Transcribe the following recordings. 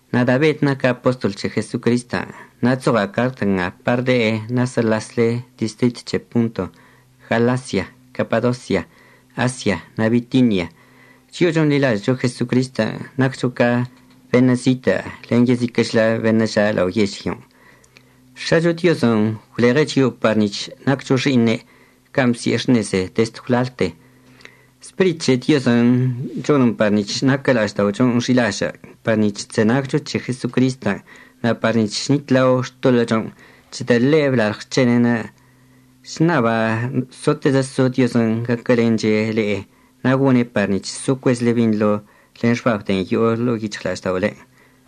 Nada' Bed naca' apostol c̱he Jesocristən'. Na' chzoɉa' cart nga par le'e nasə'əlasle distrit c̱he Ponto, Galasia, Capadosia, Asia na' Bitinia. Chio'o chonḻilažə'əcho Jesocristən' naccho ca beṉə' zitə' len yeziquə'əchlə beṉə' ža' lao yežlyon'. X̱acho Diozən' gwleɉe' chio'o pa nic̱h naccho xi'iṉe' can' bsi'e xṉeze dezd gwlalte. Spirit c̱he Diozən' chonən par nic̱h naquə la'ažda'ochon' xi'ilažə' par nic̱h chzenagcho c̱he Jesocristən' na' par nic̱h chnitlao xtoḻə'əchon' c̱hedə' ḻe' blalɉ xc̱hene'enə'. Chṉaba' sotezə so Diozən' gaquəlenche' le'e na' gone' par nic̱h so cuezəchle binḻo len xbab de'en yo'o ḻo'o yic̱hɉla'ažda'olen'.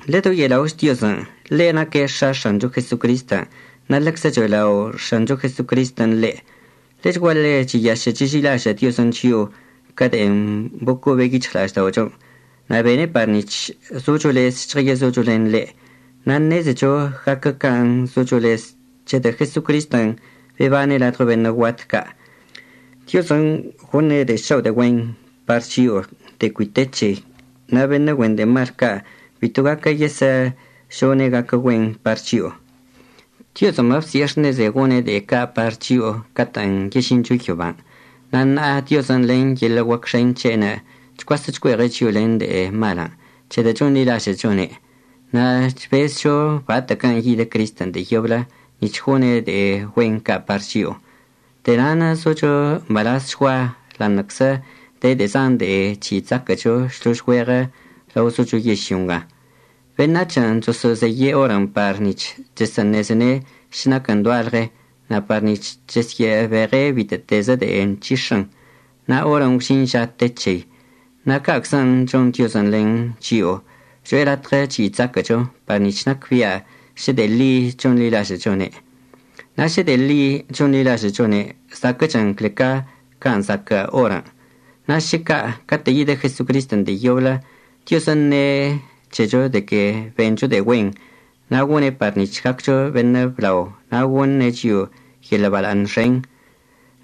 Ḻedoye'ela'och Diozən'. Ḻe' naque' X̱a X̱ancho Jesocristən' na' ḻeczə cho'elao' X̱ancho Jesocristən' ḻe'. Ḻechguaḻe cheyašə' cheži'ilažə' Diozən' chio'o ca de'en bocobe' yic̱hɉla'ažda'ochon' na' bene' par nic̱h zocho lez žɉəyezocho len ḻe'. Na' ṉezecho gaquə can' zocho lez c̱hedə' Jesocristən' bebane' ladɉo beṉə' guat ca'. Diozən' gone' de'e šao' de'e güen par chio'o de'e cui te c̱hei, na' beṉə' güen de'e mal ca' bito gaquə yesə'əžone' gaquə güen par chio'o. Diozən' babsi'e xṉeze gone' de'e ca' par chio'o catə'ən yežincho yoban'. Na' ṉa'a Diozən' len yeḻə' guac xen c̱he'enə' chcuasə' chcue'eɉe' chio'o len de'e malən' c̱hedə' chonḻilažə'əchone'. Na' chbezcho batə'əquən' yidə Cristən' de'e yoblə nic̱h gone' de'e güen ca' par chio'o. De'e na'anə' zocho mbalazchgua ḻa'aṉə'əczə de de'e zan de'en chyi' chzaquə'əcho šlož güeɉə lao zocho yežlyo nga. Beṉac̱hən' choso'ozeye' orən' par nic̱h chesə'əṉezene' šə naquən doalɉe na' par nic̱h chesyə'əbeɉe' bitə'ətezə de'en nc̱hix̱ən. Na' orən' gwžin ža te c̱hei. Na' ca'aczən' chon Diozən' len chio'o, cho'e latɉə chyi' chzaquə'əcho par nic̱h nacbia' šə de'e ḻi chonḻilažə'əchone'. Na' šə de'e ḻi chonḻilažə'əchone' zaquə'əchən cle ca can' zaquə' orən'. Na' šə ca' catə' yidə Jesocristən' de'e yoblə, Diozən' əṉe' c̱hecho de que bencho de'e güen, na' gone' par nic̱h gaccho beṉə' blao na' goṉe' chio'o yeḻə' bala'aṉ xen.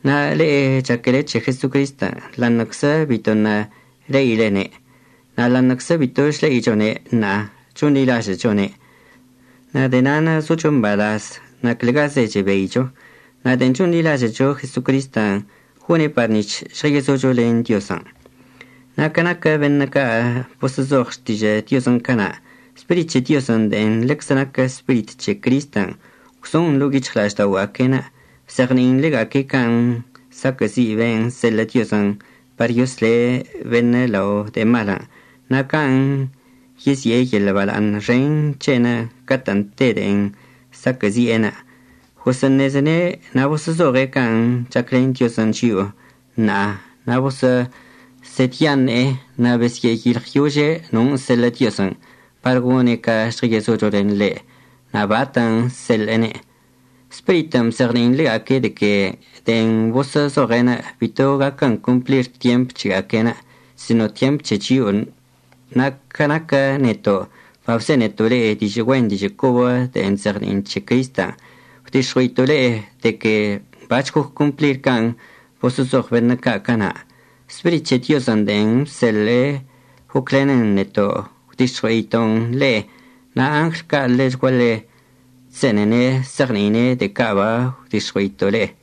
Na' le'e chaquele c̱he Jesocristən' ḻa'aṉə'əczə bitoṉə' le'ilene'. Na' ḻa'aṉə'əczə bito chle'ichone' ṉa'a chonḻilažə'əchone'. Na' de'e na'anə' zocho mbalaz na' clegazə chebeicho. Na' de'en chonḻilažə'əcho Jesocristən', gone' par nic̱h žɉəyezocho len Diozən'. Na' ca naquə beṉə' ca' boso'ozoɉ Xtižə' Diozən' cana', Spirit c̱he Diozən' de'en ḻeczə naquən Spirit c̱he Cristən' gwzon ḻo'o yic̱hɉla'ažda'oga'aque'enə', bzeɉni'in ḻega'aque' can' saquə'əzi' ben' əseḻə' Diozən' par yosle' beṉə' lao de'e malən' na' can' yezi'e yeḻə' bala'aṉ xen c̱he'enə' catə'ən te de'en saquə'əzi'enə'. Gosə'əṉezene' na' boso'ozoɉe' can' chaclen Diozən' chio'o ṉa'a. Na' boso'osedyaṉe'e na' besyə'əyilɉyože' non' əseḻə' Diozən' par gone' ca žɉəyezocho len ḻe' na' batən' əseḻe'ene'. Spiritən' bzeɉni'in ḻega'aque' de que de'en boso'ozoɉe'enə' bito gaquən complir tyemp c̱hega'aque'enə' sino tyemp c̱he chio'onə'. Na' ca naquə neto' babzeneto' le'e dižə' güen dižə' cobə de'en chzeɉni'in c̱he Cristən', gwdix̱ɉue'ito' le'e de que bac̱h goc complir can' boso'ozoɉ beṉə' ca' cana'. Spirit c̱he Diozən' de'en bseḻe'e goclenən neto' gwdix̱ɉue'ito'on le'e. Na' angl ca' ḻechguaḻe chse'enene' se'eɉni'ine' de'e ca' bagwdix̱ɉue'ito' le'e.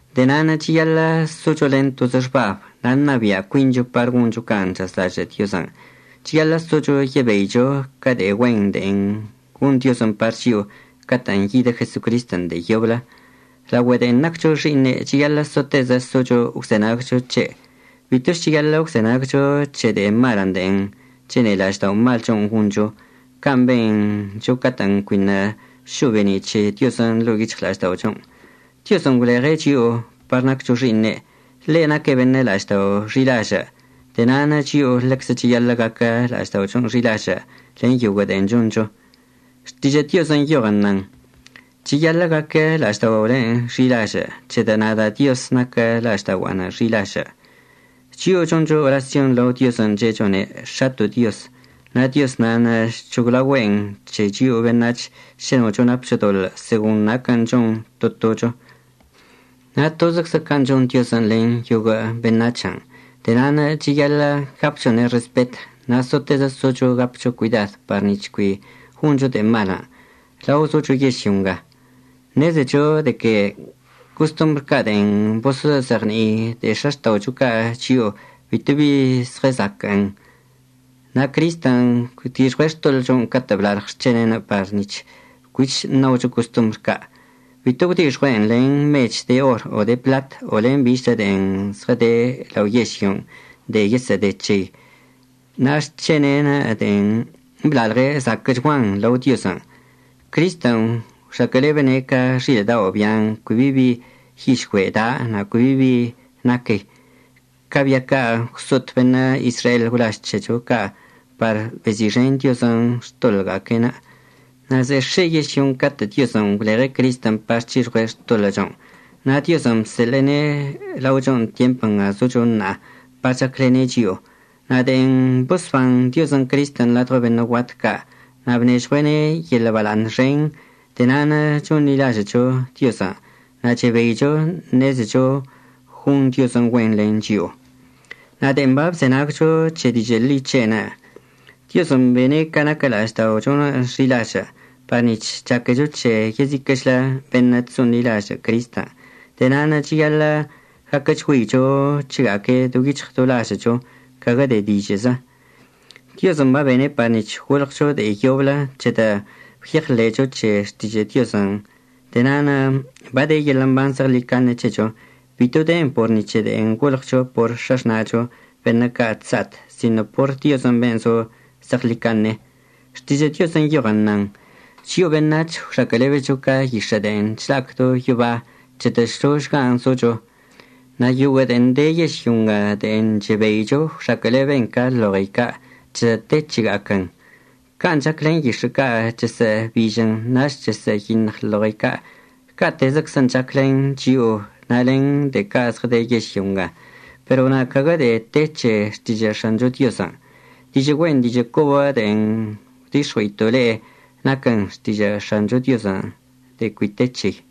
De'e na'anə' cheyaḻə' socho len tozə xbab na' ṉabia' cuincho par goncho can' chazlažə' Diozən'. Cheyaḻə' socho yebeicho ca de'e güen de'en gon Diozən' par chio'o catə'ən yidə Jesocristən' de'e yoblə. Laogüe de'en naccho xi'iṉe' cheyaḻə' sotezə socho əgwzenagcho c̱he'. Bitoch cheyaḻə' əgwzenagcho c̱he de'e malən' de'en chene'e la'ažda'omalchon' goncho can' bencho catə'ən cuiṉə' šo'o be'eni' c̱he Diozən' ḻo'o yic̱hɉla'ažda'ochon'. Diozən' gwleɉe' chio'o par naccho xi'iṉe'. Ḻe' naque' beṉə' la'aždao' xi'ilažə'. De'e na'anə' chio'o ḻeczə cheyaḻə' gaquə la'ažda'ochon' xi'ilažə' len yoguə' de'en choncho. Xtižə' Diozən' nyoɉən nan: “Cheyaḻə' gaquə la'ažda'olen' xi'ilažə' c̱hedə' nada' Dioz naquə la'ažda'ogua'anə' xi'ilažə'.” Chio'o choncho orasyon lao Diozən' che'echone' “X̱ato' Dioz”. Na' Dioz nan' chc̱hoglaogüe'en c̱he chio'o beṉac̱h šə nocho napcho doḻə' segon naquən' chon to tocho. Na' tozəczə can' chon Diozən' len yoguə' beṉac̱hən'. De'e na'anə' cheyaḻə' gapchone' respet na' sotezə socho gapcho cuidad par nic̱h cui goncho de'e mal lao socho yežlyo nga. Ṉezecho de que costombr ca' de'en boso'ozeɉni'i de'e x̱axta'ocho ca' chio'o bitobi zɉəzaquə'ən. Na' Cristən' gwdixɉue' xtoḻə'əchon' catə' blalɉ xc̱hene'enə' par nic̱h cuich ṉaocho costombr ca'. Bito gwdixɉue'en len mech de or o de pḻat o len bichlə de'en zɉəde lao yežlyon' de'en yesə'əde c̱hei. Na' xc̱hene'enə' de'en blalɉe' zaquə'əchguan lao Diozən'. Cristən' gwxaquə'əlebene' ca xilə' dao' bian' cui bi bi yižgüe' da' na' cui bi bi naquei, ca bia ca' gwso'ot beṉə' Izrael gwlaž c̱hecho ca' par bezi'ixen Diozən' xtoḻə'əga'aque'enə'. Na' ze'e x̱e yežlyon' catə' Diozən' gwleɉe' Cristən' par c̱hixɉue' xtoḻə'əchon'. Na' Diozən' bseḻe'ene' laochon' tyemp nga zocho ṉa'a par chaclene' chio'o. Na' de'en bosban Diozən' Cristən' ladɉo beṉə' guat ca' na' bnežɉue'ene' yeḻə' bala'aṉ xen, de'e na'anə' chonḻilažə'əcho Diozən' na' chebeicho ṉezecho gon Diozən' güen len chio'o. Na' de'en bachzenagcho c̱he dižə' ḻi c̱he'enə', Diozən' bene' ca naquə la'ažda'ochonə' xi'ilažə', par nic̱h chaquecho c̱he yeziquə'əchlə beṉə' chso'onḻilažə' Cristən'. De'e na'anə' cheyaḻə' gaquəchgüeicho c̱hega'aque' do yic̱hɉ do lažə'əcho, caguə de'e dižə'əzə. Diozən' babene' par nic̱h golɉcho de'e yoblə c̱hedə' gwyeɉḻe'echo c̱he xtižə' Diozən'. De'e na'anə' bade yeḻə' mban zeɉḻicaṉe c̱hecho. Bito den por ni c̱he de'en golɉcho por x̱axna'acho beṉə' ca' chsa'at, sino por Diozən' ben' zo zeɉḻicaṉe. Xtižə' Diozən' nyoɉən, nan: Chio'o beṉac̱h gwxaquə'əlebecho ca yix̱ə' de'en chla'ac do yoba, c̱hedə' šložgan' zocho. Na' yoguə' de'en de yežlyo nga de'en chebeicho gwxaquə'əleben ca loɉei ca', c̱hedə' te c̱hega'aquən'. Can' chac len yix̱ə' ca', chesə'əbižən nach chesə'əyiṉɉ loɉei ca', ca'atezəczən' chac len chio'o na' len de'e ca' zɉəde yežlyo nga. Pero na' caguə de'e te c̱he Xtižə' X̱ancho Diozən'. Dižə' güen dižə' cobən' de'en gwdix̱ɉue'ito' le'e naquən xtižə' X̱ancho Diozən' de'en cui te c̱hei.